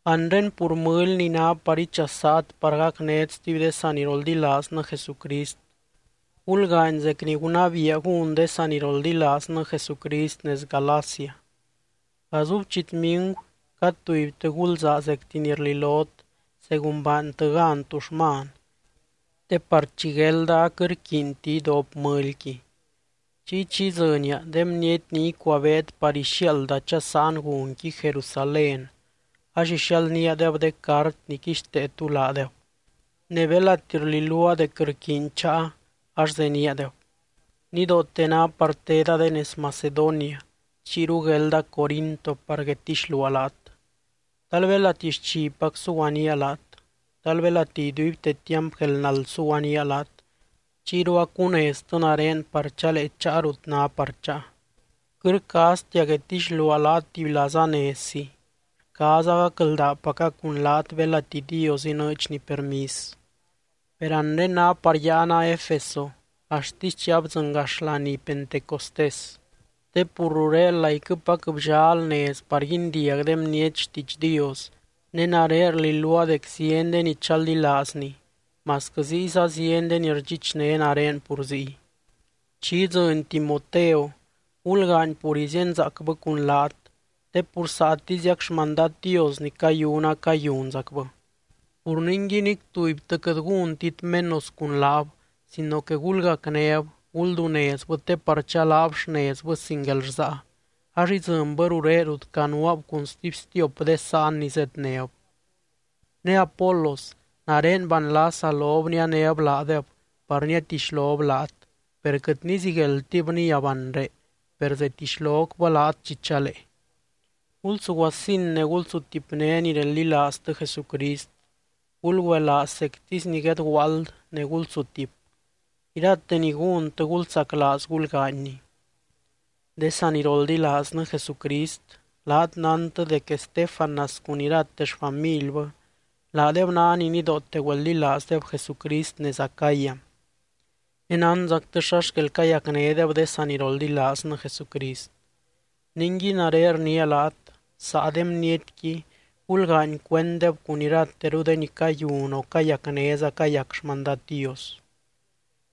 Anre pur mɨly ni ná par ichasaat par gacnét stuby de saniroldilaaznɨ Jesucrist, gulgaany zec ni gunabiia gún de saniroldilaaznɨ Jesucrist nez Galacia. Gazub chitmigu cad tubytɨ gulzaa zecti ni rlilot según baantɨ gan tuxman, te par chi guelda aquɨt rquiinti idop mɨlyqui. Chiy chi idzɨnia, de bniety ni icuabeet par ixiaalda chasáan gunqui Jerusalén ax ixialdníadeb de cart ni quixtee tú laadeb. Ne belati rliluaa dec rquiiny cháa ax zeníadeb. Nidoote ná par teda de nez Macedonia chiyru guelda Corinto par guedtixluaa laat. Tal belati xchipac suguanía laat. Tal belati iduibte tiamp guelnald suguanía laat, chiyru acuneztɨ nare par chalee cháa rut ná par cháa. Quɨt rcaaztia guedtixluaa laat tubylazanezzi, rcaaza gacldaapaca cun laat belati Dios inɨɨdxny permis. Per anre ná par yáana Efeso axtisy chi abdzɨngax laní Pentecostés, te pur ruré laiquɨpac bllal nez par guindiag de bniety xtiidx Dios ne nare rliluaa dec zieny de ni chaldilaazny, masquɨ ziyza zieny de ni rdxichné nare pur ziy. Chi idzɨny Timoteo, gulgaany pur izíenzaacbɨ cun laat, te pur saatiziac xmandad Dios ni cayuna cayunzacbɨ. Pur ningui nic tubytɨ quɨt gúntit menos cun laab sino que gulgacnéb, guldunezbɨ te par chalaab xnezbɨ sin guelrsaa ax idzɨnbɨ ruré rut canuaab cun stuby stiop de sáan ni zednéb. Ne Apolos, nare banlasa lob nianéb laadeb par niatixlob laat, per quɨt nizigueldtib níab anre, per zetixlocbɨ laat chi chalee. Gulsuguasin ne gulsutipné ni reldilaaztɨ Jesucrist. Gulgüelaaz zectisy ni guedguaald ne gulsutip. Irate ni gúntɨ, gulsaclaaz gulgaanyni. De saniroldilaaznɨ Jesucrist, laat nántɨ dec Estéfanas cun irate xfamilbɨ laadeb ná ni nidoote güeldilaazdeb Jesucrist nez Acaya, ne nánzactɨ xa xquel cayacnédeb de saniroldilaaznɨ Jesucrist. Ningui nare rniia laat: Saa de bnietqui gulgaany cuenddeb cun irateru de ni cayun o cayacnéza cayac xmandad Dios.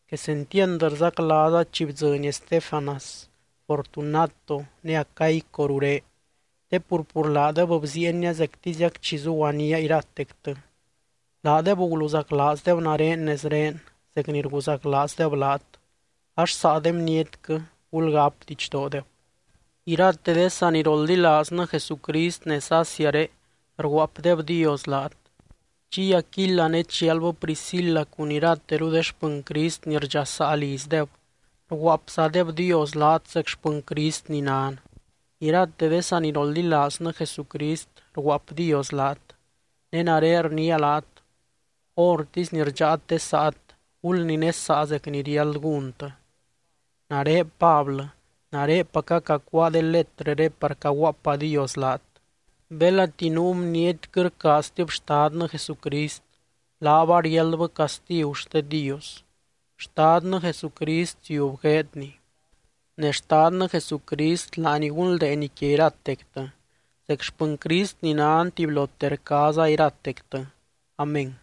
Quesentiand rzaclaaza chi bdzɨny Estéfanas, Fortunato ne Acaico ruré. Te pur, pur laadeb bziienia zectiziac chi zuguaníaa iratectɨ. Laadeb guluzaclaazdeb nare nezré zec ni rguzaclaazdeb laat, ax saa de bnietquɨ gulgáp didxdoodeb. Irate de saniroldilaaznɨ Jesucrist nez Asiaré rguaapdebdios laat. Chiy Aquila ne chialbɨ Priscila cun irateru de xpɨny Crist ni rdxasaa lizdeb, rguaapzadebdios laat zec xpɨny Crist ni nan. Irate de saniroldilaaznɨ Jesucrist rguaapdios laat. Ne nare rniia laat: Hórtisy ni rdxáat de saat, gulninesaa zec ni riáld gúntɨ. Nare Pablɨ, narepaca cacuáa de letrɨré par caguaapadios laat. Belati nuu bniety quɨt rcaaztib Xtadnɨ Jesucrist, laab ariáldbɨ castigu xte Dios. ¡Xtadnɨ Jesucrist ziub gueedny! Ne Xtadnɨ Jesucrist laany gunldeeny quia iratectɨ. Zec xpɨny Crist ni nan tubylote rcaaza iratectɨ. Amén.